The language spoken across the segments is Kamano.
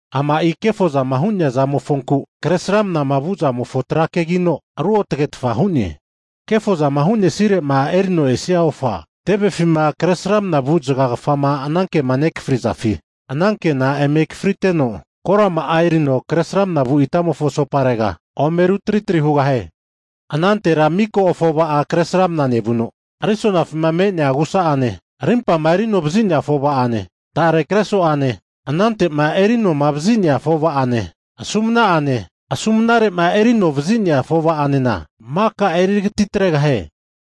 Ama'i kefozama hu'nea zamofonku kresramna vu'zamofo trakegino, ruotagetfa hu'ne. Kefozama hu'nesire'ma erino esia ofa, tevefima kresramna vu zagagafama anankema nekafrizafi ananke'na eme akafriteno, korama'a erino kresramna vu itamofo asoparega ome rutritri hugahie. Anantera miko afova'a kresramna nevuno, risonafima me'nea agusa'ane, rimpama eri anovazi'nea afova'ane, tare kreso'ane anante'ma eri anoma vazi'nea afova'ane, asumna'ane, asumnare'ma erino vazi'nea afovanena, maka eritagati atregahie.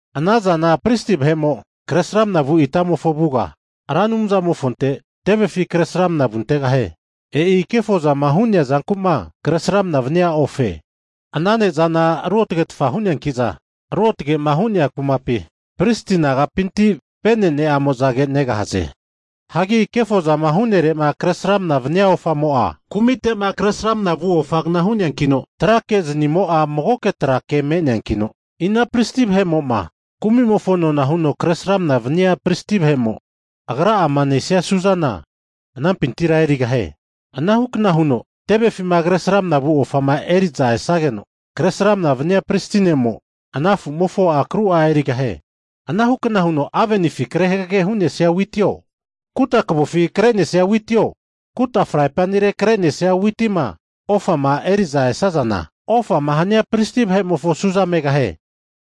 Ana zana pristi vahe'mo kresramna vu itamofo avuga Ra Anumzamofonte tevefi kresramna vuntegahie. E'i kefozama hu'nea zanku'ma kresramnama vania ofe. Ana ne'zana ruotagetfa hu'neanki'za ruotage'ma hu'nea kumapi, pristi nagapinti venene'amozage negahaze. Hagi kefozama hu'nere'ma kresramna vania ofamo'a, kumite'ma kresramna vu ofagna hu'neankino, trakezni'amo'a magoke trake me'neankino, ina pristi vahe'mo'ma kumi'mofo nona huno kresramna vania pristi vahe'mo, agra'ama nesia su'zana, anampintira erigahie. Anahukna huno tevefima kresramna vu ofama eri'za esageno kresramna vania pristi ne'mo, ana afu'mofo akru'a erigahie. Anahukna huno avenifi kre hagage hu'nesia witio, kuta kavofi kre'nesia witio, kuta fraipanire kre'nesia witima ofama eri'za esazana, ofama hania pristi vahe'mofo su'za megahie.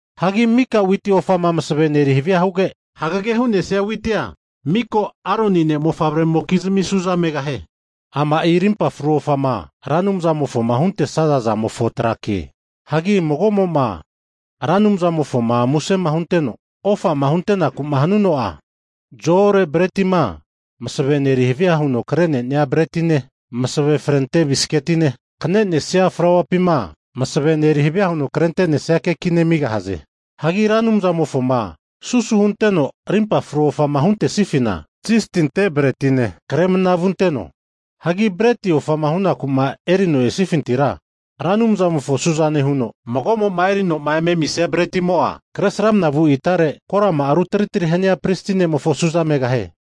Hagi mika witi ofama masavene eri havia huge, hagage hu'nesia witia miko Aroni ne' mofavre'mokizmi su'za megahie. Ama'i rimpa fru ofama Ra Anumzamofoma huntesaza zamofo trake. Hagi mago'mo'ma Ra Anumzamofoma muse hunteno ofama huntenaku'ma hanuno'a, zo-ore bretima masavene eri havia huno kre'nenia bretine, masave frente bisketine, kne'nesia flauapima masavena eri havia huno krente'nesia kekine amigahaze. Hagi Ra Anumzamofoma susu hunteno rimpa fru ofama huntesifina, zisti ante bretine kre mana vunteno. Hagi breti ofama hunaku erino esifintira, Ra Anumzamofo suzane huno mago'mago'ma erinoma eme amisia bretimo'a, kresramana vu itare korama rutri tri hania pristi ne'mofo su'za megahie.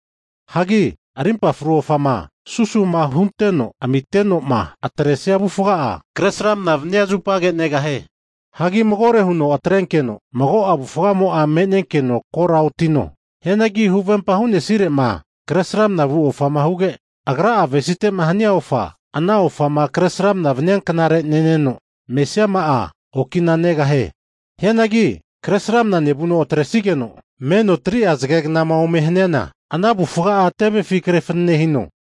Hagi rimpa fru ofama susu'ma hunteno amite'noma atresia avufga'a, kresramnama vania zupage negahie. Hagi magore huno atrenkeno, mago'a avufgamo'a me'nenkeno kora otino. Hianagi huvempa hu'nesire'ma kresramna vu ofama huge, agra'a avesite'ma hania ofa, ana ofama kresramnama vania knare neneno, mesiama'a okina negahie. Hianagi Kresramanama nevuno'ma atresageno 3'a zageknama ome haniana, ana avufga'a tevefi kre fanane hino.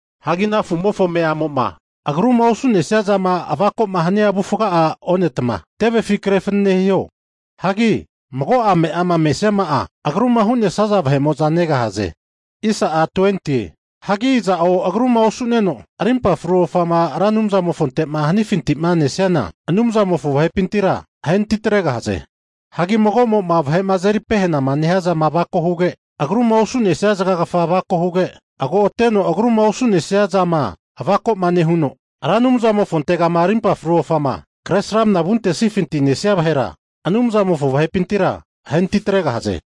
Hagi ana afu'mofo ame'amo'ma agruma osu'nesia zama avako'ma hania avufga'a onetma, tevefi kre fanane hiho. Hagi mago'a ame'ama mesiama'a agruma hu'nesaza vahe'mo'za negahaze. Hagi iza'o agruma osu'neno, rimpa fru ofama Ra Anumzamofonte'ma hanifinti'ma nesiana, Anumzamofo vahepintira ahe natitregahaze. Hagi mago'mo'ma vahe'ma azeri pehanama nehiazama avako huge, agruma osu'nesia zagagafa avako huge, agoteno agruma osu'nesia zama avako'ma nehuno, Ra Anumzamofontegama rimpa fru ofama kresramna vuntesnifinti'ma nesia vahera, Anumzamofo vahepintira ahe natitregahaze.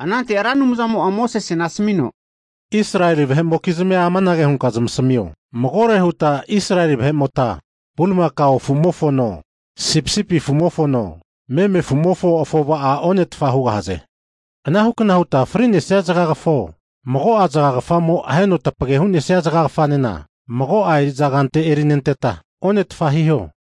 Anante Ra Anumzamo'a Mosesena asamino, Israeli vahe'mokizmia anage hunka zamasamio, Magore huta Israeli vahe'mota bulimakao afumofono, sipisipi afumofono, meme afu'mofo afova'a onetfa hugahaze. Anahukna huta fri'nesia zagagafao, mago'a zagagafamo aheno tapage hu'nesia zagagafanena, mago'a eri'za kante erinenteta, onetfa hiho.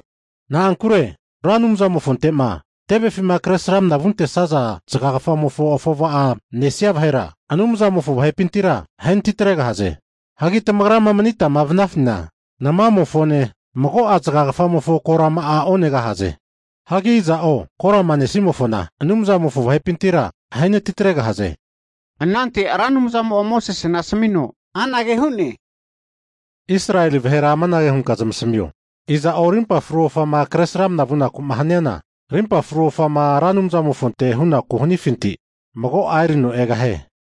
Na'ankure Ra Anumzamofonte'ma tevefima kresramna vuntesaza zagagafamofo afova'a nesia vahera, Anumzamofo vahepintira ahe natitregahaze. Hagi tamagrama manitama vanafina, namamofone, mago'a zagagafamofo korama'a onegahaze. Hagi iza'o korama nesimofona, Anumzamofo vahepintira ahe natitregahaze. Anante Ra Anumzamo'a Mosesena asamino anage hu'ne, Israeli vahera anage hunka zamasmio, iza'o rimpa fru ofama kresramna vunaku'ma haniana, rimpa fru ofama Ra Anumzamofonte hunaku'ma hanifinti, mago'a erino egahie.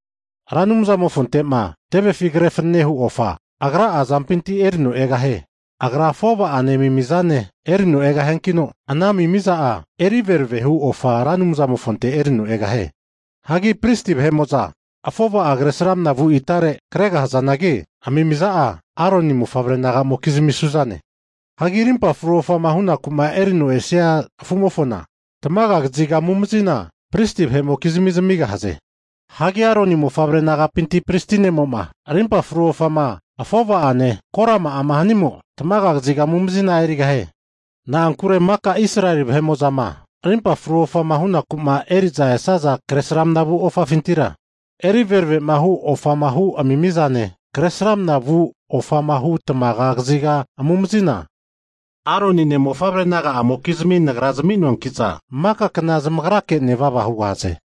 Ra Anumzamofonte'ma tevefi kre fananehu ofa agra'a azampinti erino egahie. Agra afova'ane amimizane erino egahiankino, ana amimiza'a eri veravehu ofa Ra Anumzamofonte erino egahie. Hagi pristi vahe'mo'za afova'a kresramna vu itare kregahazanagi, amimiza'a Aroni mofavre naga'mokizmi su'zane. Hagi rimpa fru ofama hunaku'ma eri'noma esia afu'mofona, tamaga kaziga amumazina pristi vahe'mokizmi zamigahaze. Hagi Aroni mofavre nagapinti pristi ne'mo'ma, rimpa fru ofama afova'ane, korama'ama hanimo, tamaga kaziga amumazina erigahie. Na'ankure maka Israeli vahe'mo'zama rimpa fru ofama hu'naku'ma eri'zama esaza kresramna vu ofafintira, eri verave hu ofama hu amimizane, kresramna vu ofama hu tamaga kaziga amumazina Aronine mofavre naga'amokizmi Nagra zami'noanki'za, maka kna zamagrake nevava hugahaze.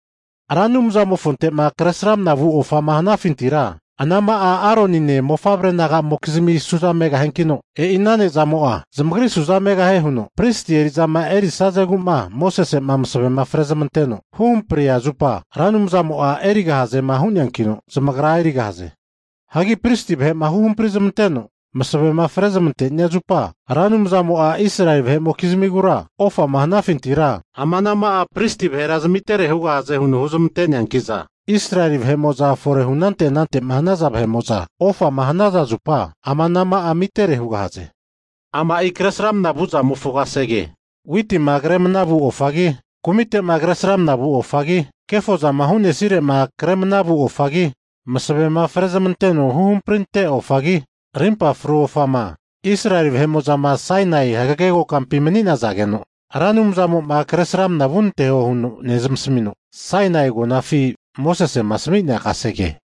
Ra Anumzamofonte'ma kresramna vu ofama hanafintira, ana'ma'a Aronine mofavre'naga'amokizmi su'za megahiankino, e'i ana ne'zamo'a zamagri su'za megahie huno pristi eri'zama erisazegu'ma Mosese'ma masavema frezmanteno huhampria zupa, Ra Anumzamo'a erigahaze hu'neankino, zamagra erigahaze. Hagi pristi vahe'ma huhampri zmanteno masavema frezmantenia zupa, Ra Anumzamo'a Israeli vahe'mokizmigura ofama hanafintira ama anama'a pristi vahera zamitere hugahaze huno huzmante'neanki'za, Israeli vahe'mo'za fore hu anante anante'ma hanaza vahe'mo'za ofama hanaza zupa, ama anama'a amitere hugahaze. Ama'i kresramna vu'zamofo kasege, witima kre mana vu ofagi, kumite'ma kresramna vu ofagi, kefozama hu'nesire'ma Kresramana vu ofagi, masavema frezmanteno huhamprinte ofagi, rimpa fru ofama, Israeli vahe'mo'zama Sainai hagage kokampima mani'nazageno, Ra Anumzamo'ma kresramna vunanteho huno nezmasamino, Sainai agonafi Mosesema ami'nea kasege.